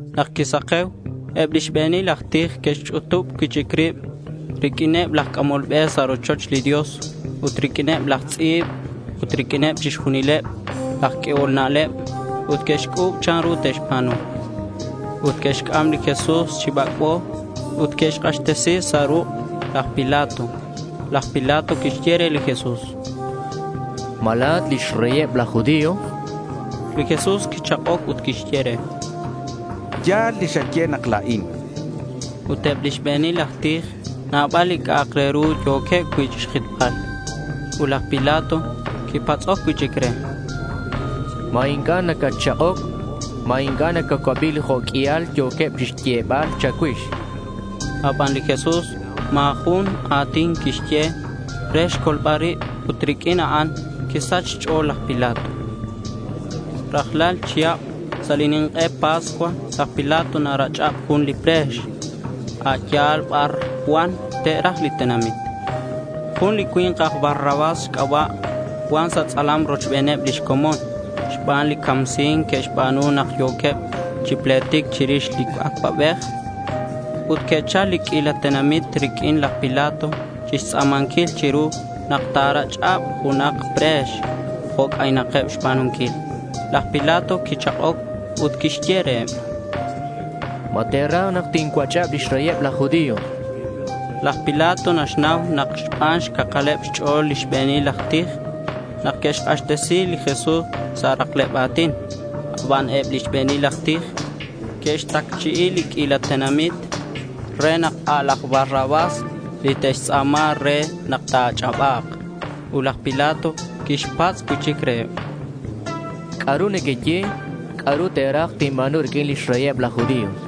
Nak quisake̱u eb lix be̱nil aj tij que'xch'utub cui'chic rib riq'uineb laj c'amol be sa' rochoch li Dios, ut riq'uineb laj tz'i̱b ut riq'uin chixjunileb laj q'uehol na'leb ut que'xc'u̱b chanru te'xba̱nu. Ut que'xc'am li Jesús chi bac'bo ut que'xk'axtesi sa' ruk' laj Pilato. Laj Pilato quixye re li Jesús: —¿Ma la̱at lix reyeb laj judío?— Li Jesús quichak'oc ut quixye re: —Ya̱l li xaye nak la̱in.— Ut eb lix be̱nil aj tij nabal li c'a'ak re ru yo̱queb cui' chixjitbal. Ut laj Pilato quixpatz' cui'chic re: —¿Ma inc'a' nacatchak'oc? ¿Ma inc'a' nacacuabi li jo' q'uial yo̱queb chixyebal cha̱cuix? chan laj Pilato re. Aban li Jesús ma̱ jun a̱tin quixye re xcolbal rib ut riq'uin a'an quisach xch'o̱l laj Pilato. Rajlal chihab sa' li nink'e Pascua laj Pilato narach'ab jun li pre̱x, a' ya̱l bar cuan te'raj li tenamit. Jun li cui̱nk aj Barrabás xc'aba' cuan sa' tz'alam rochbeneb lix comon xban li camsi̱nc que'xba̱nu nak yo̱queb chi pletic chirix li acuabej. Ut que'chal li q'uila tenamit riq'uin laj Pilato chixtz'a̱manquil chiru nak ta̱rach'ab junak pre̱x jo' c'aynakeb xba̱nunquil. Laj Pilato quichak'oc ut quixye reheb: —¿Ma te̱raj nak tincuach'ab lix reyeb laj judío?— Laj Pilato naxnau nak xban xcakaleb xch'o̱l lix be̱nil aj tij nak que'xk'axtesi li Jesús sa' rakleb a̱tin. Aban eb lix be̱nil aj tij que'xtacchi'i li q'uila tenamit re nak a' laj Barrabás li te'xtz'a̱ma re nak ta̱ach'aba̱k. Ut laj Pilato quixpatz' cui'chic reheb: —¿C'a'ru nequeye? ¿C'a'ru te̱raj tinba̱nu riq'uin lix reyeb laj judío?—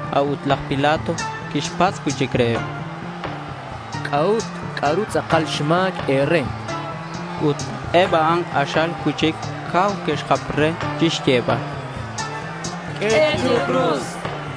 A'ut laj Pilato quixpatz' cui'chic reheb: —¿C'a'ut? ¿C'a'ru tz'akal xma̱c e̱re? chan. Ut eb a'an k'axal cui'chic cau que'xjap re chixyebal: —¡Q'ue chiru cruz!—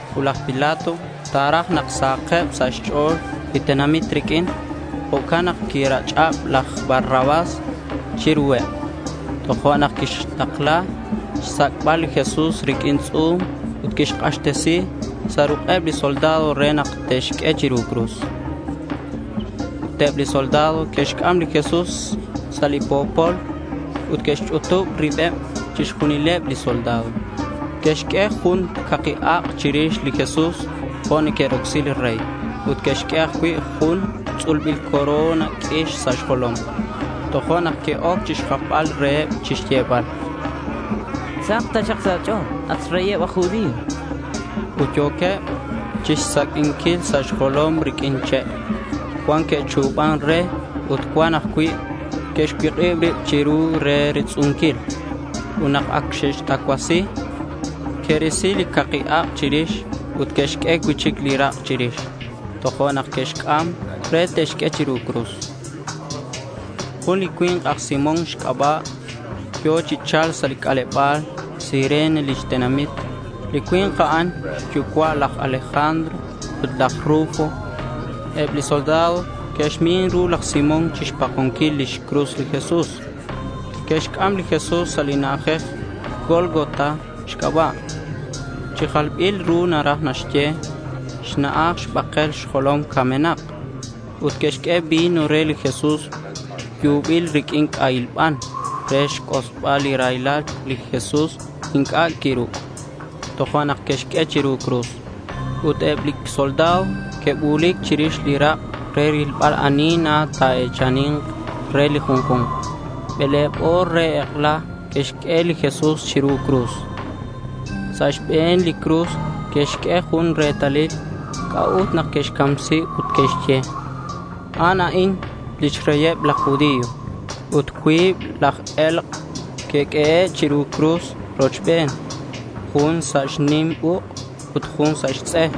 Ut laj Pilato ta̱raj nak sahakeb sa' xch'o̱l li tenamit riq'uin. Jo'can nak quirach'ab laj Barrabás chiruheb. Tojo'nak quixtakla xsac'bal li Jesús riq'uin tz'u̱m ut quixk'axtesi sa' ruk'eb li soldado re nak te'xq'ue chiru cruz. Ut eb li soldado que'xc'am li Jesús sa' li po̱pol ut que'xch'utub ribeb chixjunileb li soldado. Que'xq'ue jun caki ak' chirix li Jesús jo' neque'rocsi li rey. Ut que'xq'ue ajcui' jun tz'ulbil corona q'uix sa' xjolom. Tojo'nak que'oc chixjapbal reheb chixyebal: —Sahak taxak sa' a̱ch'o̱l, at xReyeb laj judío, chanqueb. Ut yo̱queb chixsaq'uinquil sa' xjolom riq'uin che'. Cuan que'chu̱ban re ut cuan ajcui' que'xcuik'ib ribeb chiru re retz'unquil. Ut nak ac que'xtacuasi, que'risi li caki ak' chirix ut que'xq'ue cui'chic li rak' chirix. Tojo'nak que'xc'am re te'xq'ue chiru cruz. Jun li cui̱nk aj Simón xc'aba' yo̱ chi cha̱lc sa' c'aleba̱l. Cirene lix tenamit. Li cui̱nk a'an xyucua' laj Alejandro ut laj Rufo. Eb li soldado que'xmin ru laj Simón chixpakonquil lix cruz li Jesús. Que'xc'am li Jesús sa' li na'ajej Gólgota xc'aba'. Chi jalbil ru naraj naxye: Xna'aj Xbakel Xjolom Camenak. Ut que'xq'ue vino re li Jesús yubil riq'uin c'ahil ban re xc'osbal li raylal aban li Jesús inc'a' quiruc'. Tojo'nak que'xq'ue chiru cruz. Ut eb li soldado que'bu̱lic chirix li rak' re rilbal ani na ta̱e̱chani̱nk re li junju̱nk. Bele̱b o̱r re ek'ela que'xq'ue li Jesús chiru cruz. Sa' xbe̱n li cruz que'xq'ue jun retalil c'a'ut nak que'xcamsi ut naxye: A'an a'in lix reyeb laj judío. Ut cuib laj e̱lk' que'q'uehe' chiru cruz rochben, jun sa' xnim uk' ut jun sa' xtz'e.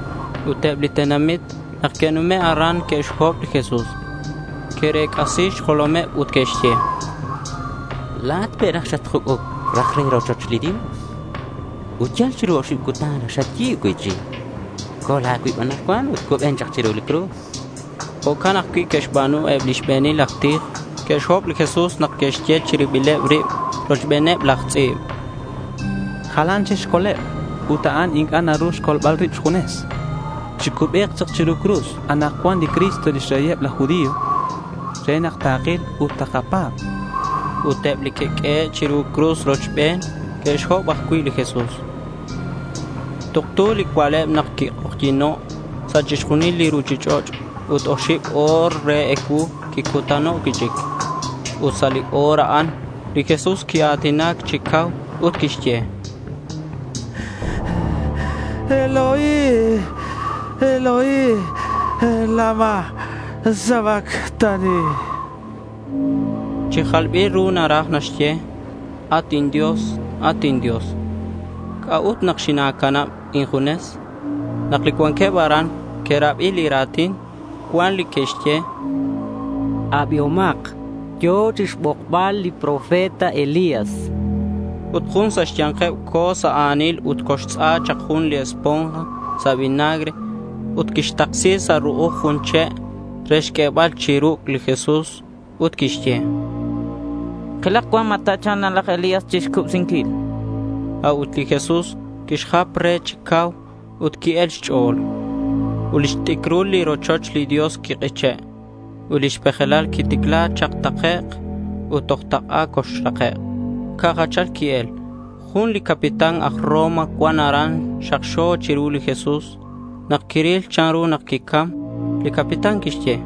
Ut eb li tenamit nak que'nume' aran que'xhob li Jesús. Que'rec'asi xjolomeb ut que'xye: —La̱at pe' xatjuc'uc raj re rochoch li Dios, ut yal chiru oxib cutan raj xayi̱b cui'chic. Col a̱cuib anakcuan ut cuben chak chiru li cruz, chanqueb. Jo'can ajcui' que'xba̱nu eb li xbe̱nil aj tij. Que'xhob li Jesús nak que'xye chi ribileb rib rochbeneb laj tz'i̱b: —Jalan chic xcoleb ut a'an inc'a' naru naxcol rib xjunes. Chicubek chak chiru li cruz anakcuan li Cristo lix Reyeb laj judío re nak takil ut takapa̱b, chanqueb. Ut eb li que'q'uehe' chiru cruz rochben que'xhob ajcui' li Jesús. Tuktu li cua'leb nak quik'ojyi̱no' sa' chixjunil li ruchich'och' ut oxib o̱r re ecuu quicutano' cui'chic. Ut sa' li o̱r a'an li Jesús quia̱tinac chi cau ut quixye: —Eloi, Eloi, ¿lama sabactani?— Chi jalbil ru naraj naxye, “At inDios, at inDios, ¿c'a'ut nak xina̱canab injunes?” Nak li cuanqueb aran que'rabi li ra̱tin, cuan li que'xye: —Abihomak, yo̱ chixbokbal li profeta Elías,— chanqueb. Ut jun sa' xya̱nkeb co̱o sa' a̱nil ut coxtz'a chak jun li esponja sa' vinagre ut quixtaksi sa' ru'uj jun che' re xq'uebal chi ruc' li Jesús ut quixye: —Kilak cuan ma ta̱cha̱lk na laj Elías chixcubsinquil, chan. A'ut li Jesús quixjap re chi cau ut qui-el xch'o̱l. Ut lix t'icrul li rochoch li Dios quik'iche', ut lix pejelal quiticla chak takec' ut toj tak'a coxrake'. Ca' jachal qui-el. Jun li capitán aj Roma cuan aran xakxo chiru li Jesús. Nak quiril chanru nak quicam, li capitán quixye: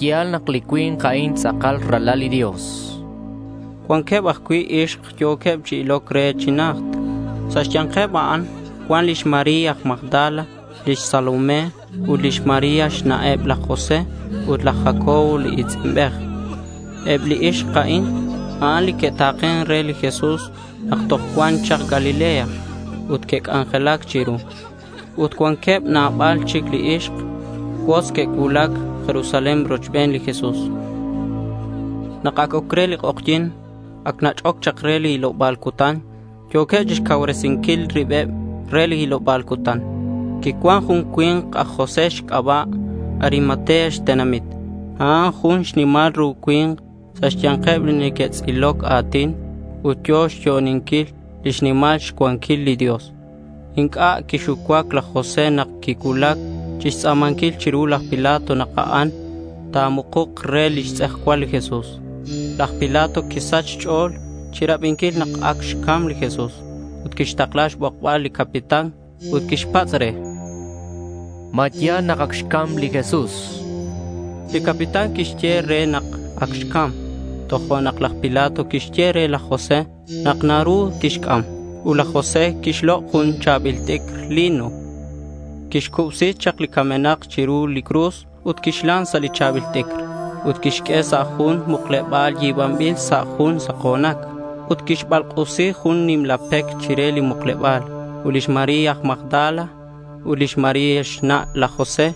—Ya̱l nak li cui̱nk a'in tz'akal Ralal li Dios.— Cuanqueb ajcui' ixk yo̱queb chi iloc chi najt. Sa' xya̱nkeb a'an cuan lix María aj Magdala, lix Salomé ut lix María xna'eb laj José ut laj Jacobo li i̱tz'inbej. Eb li ixk a'in, a'an li que'ta̱ken re li Jesús nak toj cuan chak Galilea ut que'c'anjelac chiru. Ut cuanqueb nabal chic li ixk cuotz que'cuulac Jerusalén rochben li Jesús. Nak ac oc re li k'ojyi̱n, ac nach'oc chak re li hiloba̱l cutan. Yo̱queb chixcauresinquil ribeb re li hiloba̱l cutan. Quicuan jun li cui̱nk aj José xc'aba' Arimatea xtenamit. A'an jun xnimal ru cui̱nk sa' xya̱nkeb li neque'tz'iloc a̱tin ut yo̱ chixyo'oninquil lix nimal xcuanquil li Dios. Inc'a' quixucuac laj José nak quicuulac chixtz'a̱manquil chiru laj Pilato nak a'an ta̱mukuk re lix tz'ejcual li Jesús. Laj Pilato quisach xch'o̱l chirabinquil nak ac xcam li Jesús. Ut quixtakla xbokbal li capitán ut quixpatz' re: —¿Ma ya̱l nak ac xcam li Jesús? chan re. Li capitán quixye re nak ac xcam. Tojo'nak laj Pilato quixye re laj José nak naru tixc'am. Ut laj José quixlok' jun cha̱bil t'icr lino. Quixcubsi chak li camenak chiru li cruz ut quixlan sa' li cha̱bil t'icr. Ut quixq'ue sa' jun mukleba̱l yi̱banbil sa' jun sako̱nac. Ut quixbalk'usi jun nimla pec chire li mukleba̱l. Ut lix María aj Magdala ut lix María xna' laj José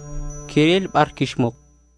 que'ril bar quixmuk.